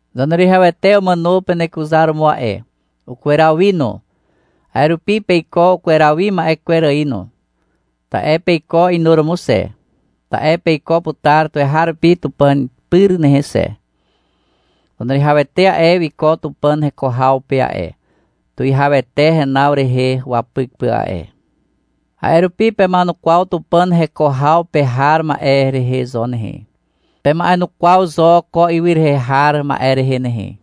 Zaneruwihawete umàno penekuzaromo a'e. Ukweraw wi no. A'e rupi peiko ukweraw wi ma'e kwer ài no. Ta'e peiko inuromo xe, ta'e peiko putar tuweharupi Tupàn pyr nehe xe. Zaneruwihawete a'e, wiko Tupàn heko haw pe a'e, tuwihawete henaw rehe wapyk pà a'e. A'e rupi pema'enukwaw Tupàn heko haw pe har ma'e rehe zo nehe. Pema'enukwaw zo ko ywy rehe har ma'e rehe nehe.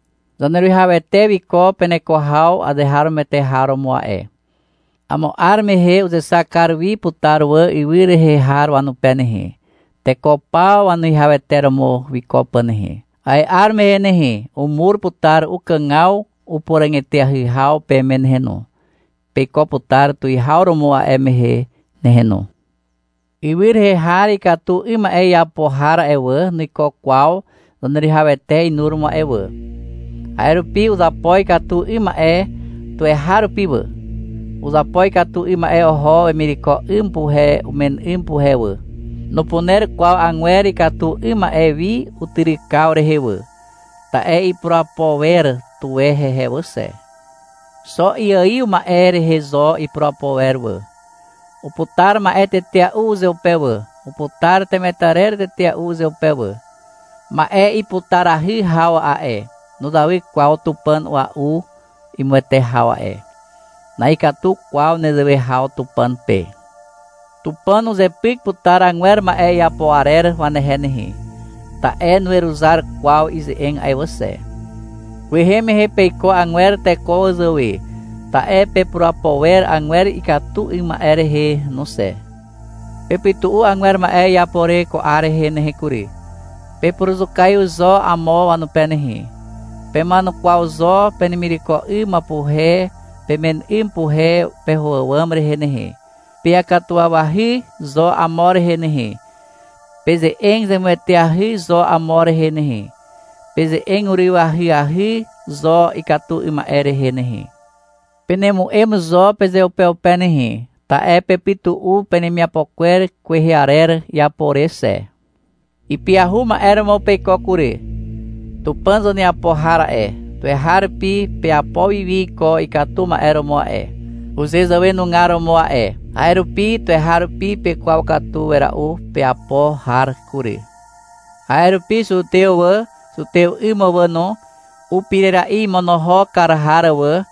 Zaneruwihawete wiko peneko haw azeharomoete har romo a'e. Amo 'ar mehe uzexak kar wi putar wà ywy rehe har wanupe nehe, teko paw wanuwihawete romo wiko pà nehe. A'e 'ar mehe nehe, umur putar ukàgaw upuràg eteahy haw peme nehe no. Peiko putar tuwihaw romo a'e mehe nehe no. Ywy rehe har ikatu 'ym ma'e iapo har a'e wà, nuiko kwaw Zaneruwihawete inuromo a'e wà. A'e rupi uzapo ikatu 'ym ma'e tuweharupi wà. Uzapo ikatu 'ym ma'e oho wemireko 'ym puhe umen 'ym puhe wà. Nupuner kwaw agwer ikatu 'ym ma'e wi utyrykaw rehe wà. Ta'e ipurapo wer tuwe hehe wà xe. Xo iaiw ma'e rehe zo ipurapo wer wà. Uputar ma'e tetea'u uzeupe wà, uputar temetarer tetea'u uzeupe wà. Ma'e iputarahy haw a'e, nuzawy kwaw tupàn a'ua'u imuwete haw a'e. Na'ikatu kwaw nezewe haw Tupàn pe. Tupàn uzepyk putar agwer ma'e iapo arer wanehe nehe, ta'e nuweruzar kwaw ize'eg a'e wà xe. Kwehe mehe peiko agwer teko wazàwe, ta'e pepurapo wer agwer ikatu 'ym ma'e rehe no xe. Pepytu'u agwer ma'e iapo re ko 'ar rehe nehe kury. Pepuruzukaiw zo amo wanupe nehe. Pema'enukwaw zo penemireko 'ym puhe pemen 'ym puhe peho àwàm rehe nehe. Peakatuwawahy zo amo rehe nehe. Peze'eg zemueteahy zo amo rehe nehe. Peze'eg uryw ahyahy zo ikatu 'ym ma'e rehe nehe. Penemu'em zo pezeupeupe nehe, ta'e pepytu'u penemiapo kwer kwehe arer iapo re xe. Ipyahu ma'e romo peiko kury. Tupàn zaneapo har a'e, tuweharupi peapo wiwi iko ikatu ma'e romo a'e, uzezàwenugar romo a'e. A'e rupi tuweharupi pekwaw katu wera'u peapo har kury. A'e rupi zutew wà, zutew 'ym wà no, upirera'i imonohok kar har wà,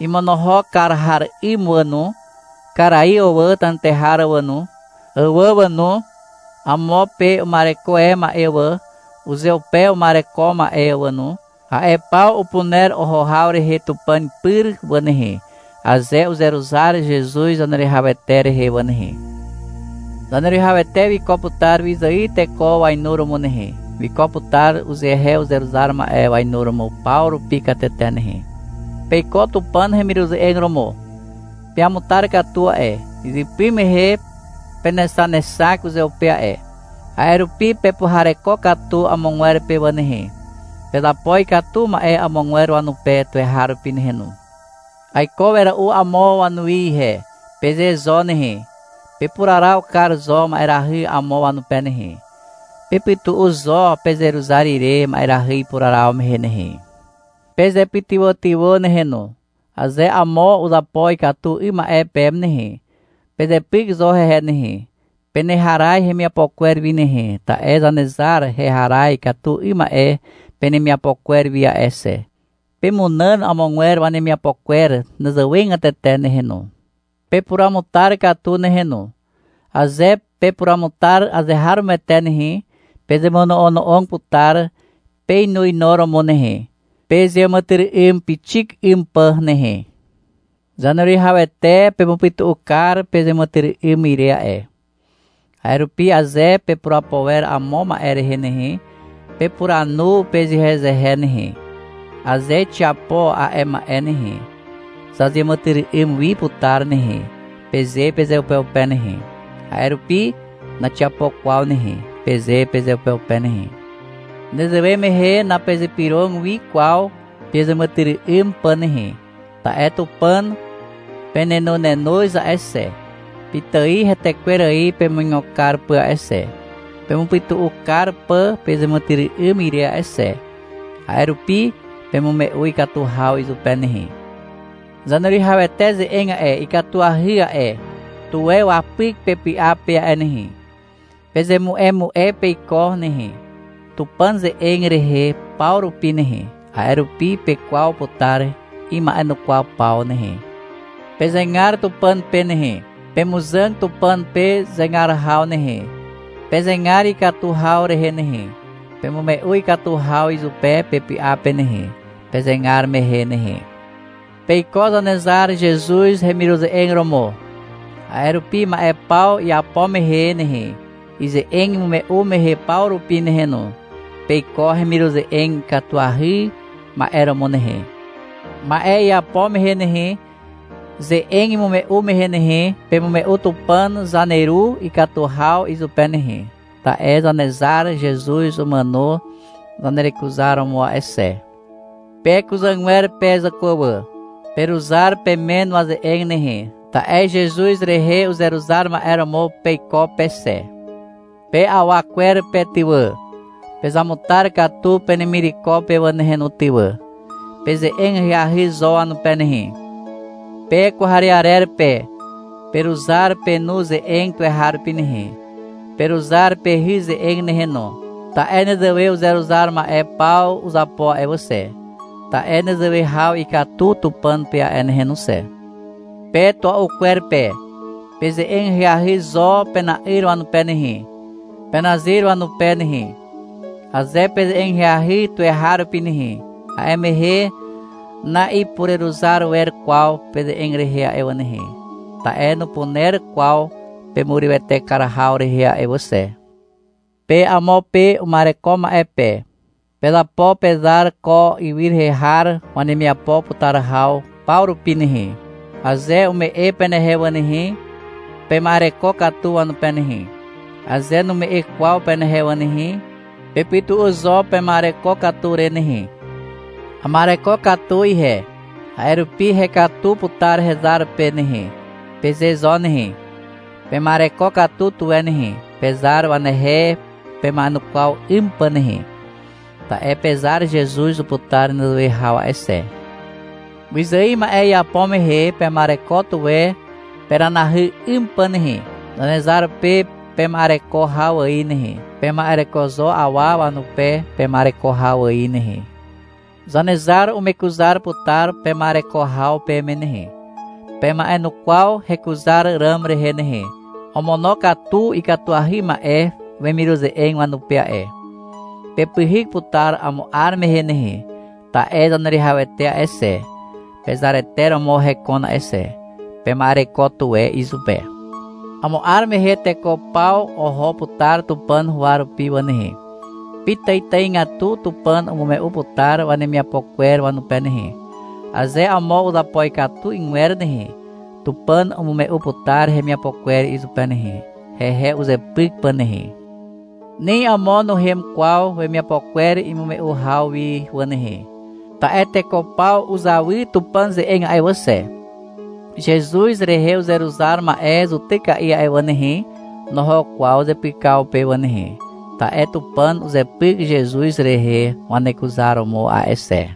imonohok kar har 'ym wà no, karaiw wà, tenetehar wà no, àwà wà no, amo pe uma'ereko e ma'e wà, uzeupe uma'ereko ma'e wà no, a'e paw upuner oho haw rehe Tupàn pyr wà nehe, aze uzeruzar Zezuz Zaneruwihawete rehe wà nehe. Zaneruwihawete wiko putar wyzài teko wainuromo nehe. Wiko putar uzehe uzeruzar ma'e wainuromo paw rupi katete nehe. Peiko Tupàn hemiruze'eg romo. Peamutar katu a'e. Izypy mehe penexanexak uzeupe a'e. A'e rupi pepuhareko katu amogwer pe wà nehe. Pezapo ikatu ma'e amogwer wanupe tuweharupi nehe no. — Aiko wera'u amo wanuwi ihe, peze zo nehe. Pepuraraw kar zo ma'erahy amo wanupe nehe. Pepytu'u zo pezeruzar ire ma'erahy ipuraraw mehe nehe. Pezepytywàtywà nehe no. Aze amo uzapo ikatu 'ym ma'e peme nehe, pezepyk zo hehe nehe, peneharaz hemiapo kwer wi nehe, ta'e Zanezar heharaz ikatu 'ym ma'e penemiapo kwer wi a'e xe. Pemunàn amogwer wanemiapo kwer nezewegatete nehe no. Pepuruamutar katu nehe no. Aze pepuruamutar azeharomoete nehe, pezemono'ono'og putar peinuinuromo nehe, pezeàmàtyry'ym pixik 'ym pà nehe. Zaneruwihawete pemupytu'u kar pezeàmàtyry'ym ire a'e. A'e rupi aze pepurapo wer amo ma'e rehe nehe, pepuranu pezehezehe nehe. — Aze xiapo a'e ma'e nehe, zazeàmàtyry'ym wi putar nehe, peze pezeupeupe nehe. — A'e rupi naxiapo kwaw nehe, peze pezeupeupe nehe. Nezewe mehe napezypyrog wi kwaw pezeàmàtyry'ym pà nehe. Ta'e Tupàn penenonenoz a'e xe, pitài hetekwer ài pemuigo kar pà a'e xe, pemupytu'u kar pà pezeàmàtyry'ym ire a'e xe. A'e rupi pemume'u ikatu haw izupe nehe. Zaneruwihawete ze'eg a'e, ikatuahy a'e. Tuwe wapyk pepy'a pe a'e nehe. Pezemu'emu'e peiko nehe, Tupàn ze'eg rehe paw rupi nehe. A'e rupi pekwaw putar ima'enukwaw paw nehe. Pezegar Tupàn pe nehe. Pemuzàg Tupàn pe zegar haw nehe. Pezegar ikatu haw rehe nehe. Pemume'u ikatu haw izupe pepy'a pe nehe, pezegar mehe nehe. Peiko Zanezar Zezuz hemiruze'eg romo. A'e rupi ma'e paw iapo mehe nehe, ize'eg imume'u mehe paw rupi nehe no, peiko hemiruze'eg ikatuahy ma'e romo nehe. Ma'e iapo mehe nehe, ze'eg imume'u mehe nehe, pemume'u Tupàn zaneru ikatu haw izupe nehe, ta'e Zanezar Zezuz umàno zanerekuzaromo a'e xe. Pe kuzàgwer pe zàkwà wà, peruzar pemen waze'eg nehe, ta'e Zezuz rehe uzeruzar ma'e romo peiko pe xe. Pe awa kwer pe ty wà, pezamutar katu penemireko pe wà nehe no ty wà. Peze'eg ahyahy zo wanupe nehe. Pe kwarearer pe, peruzar penu ze'eg tuweharupi nehe, peruzar pehy ze'eg nehe no, ta'e nezewe uzeruzar ma'e paw uzapo a'e wà xe. Ta'e nezewe haw ikatu Tupàn pe a'e nehe no xe. Pe tua'u kwer pe, peze'eg ahyahy zo pena'yr wanupe nehe, penazyr wanupe nehe. Aze peze'eg ahyahy tuweharupi nehe, a'e mehe na'ipureruzar wer kwaw peze'eg rehe a'e wà nehe, ta'e nupuner kwaw pemurywete kar haw rehe a'e wà xe. Pe amo pe uma'ereko ma'e pe, pezapo pezar ko ywy rehe har wanemiapo putar haw paw rupi nehe. Aze ume'e penehe wà nehe, pema'ereko katu wanupe nehe. Aze nume'e kwaw penehe wà nehe, pepytu'u zo pema'ereko katu re nehe. — Ama'ereko katu ihe, a'e rupi hekatu putar hezar pe nehe, peze zo nehe. Pema'ereko katu tuwe nehe, pezar wanehe pema'enukwaw 'ym pà nehe. Ta'e pezar Zezuz uputar nezewe haw a'e xe. Wyzài ma'e iapo mehe, pema'ereko tuwe peranahy 'ym pà nehe, Zanezar pe pema'ereko haw ài nehe. Pema'ereko zo awa wanupe pema'ereko haw ài nehe. Zanezar umekuzar putar pema'ereko haw peme nehe. Pema'enukwaw hekuzar ràm rehe nehe. Omonokatu ikatuahy ma'e wemiruze'eg wanupe a'e. Pepyhyk putar amo 'ar mehe nehe. Ta'e Zaneruwihawete a'e xe, pezarete romo hekon a'e xe. Pema'ereko tuwe izupe. Amo 'ar mehe teko paw oho putar Tupàn huwa rupi wà nehe. Pitàitàigatu Tupàn umume'u putar wanemiapo kwer wanupe nehe. Aze amo uzapo ikatu 'ygwer nehe, Tupàn umume'u putar hemiapo kwer izupe nehe, hehe uzepyk pà nehe. Ni amo nuhem kwaw wemiapo kwer imume'u haw wi wà nehe, ta'e teko paw uzawy Tupàn ze'eg a'e wà xe. (Zezuz rehe uzeruzar ma'e zutyka'i a'e wà nehe, noho kwaw zepykaw pe wà nehe, ta'e Tupàn uzepyk Zezuz rehe wanekuzaromo a'e xe.)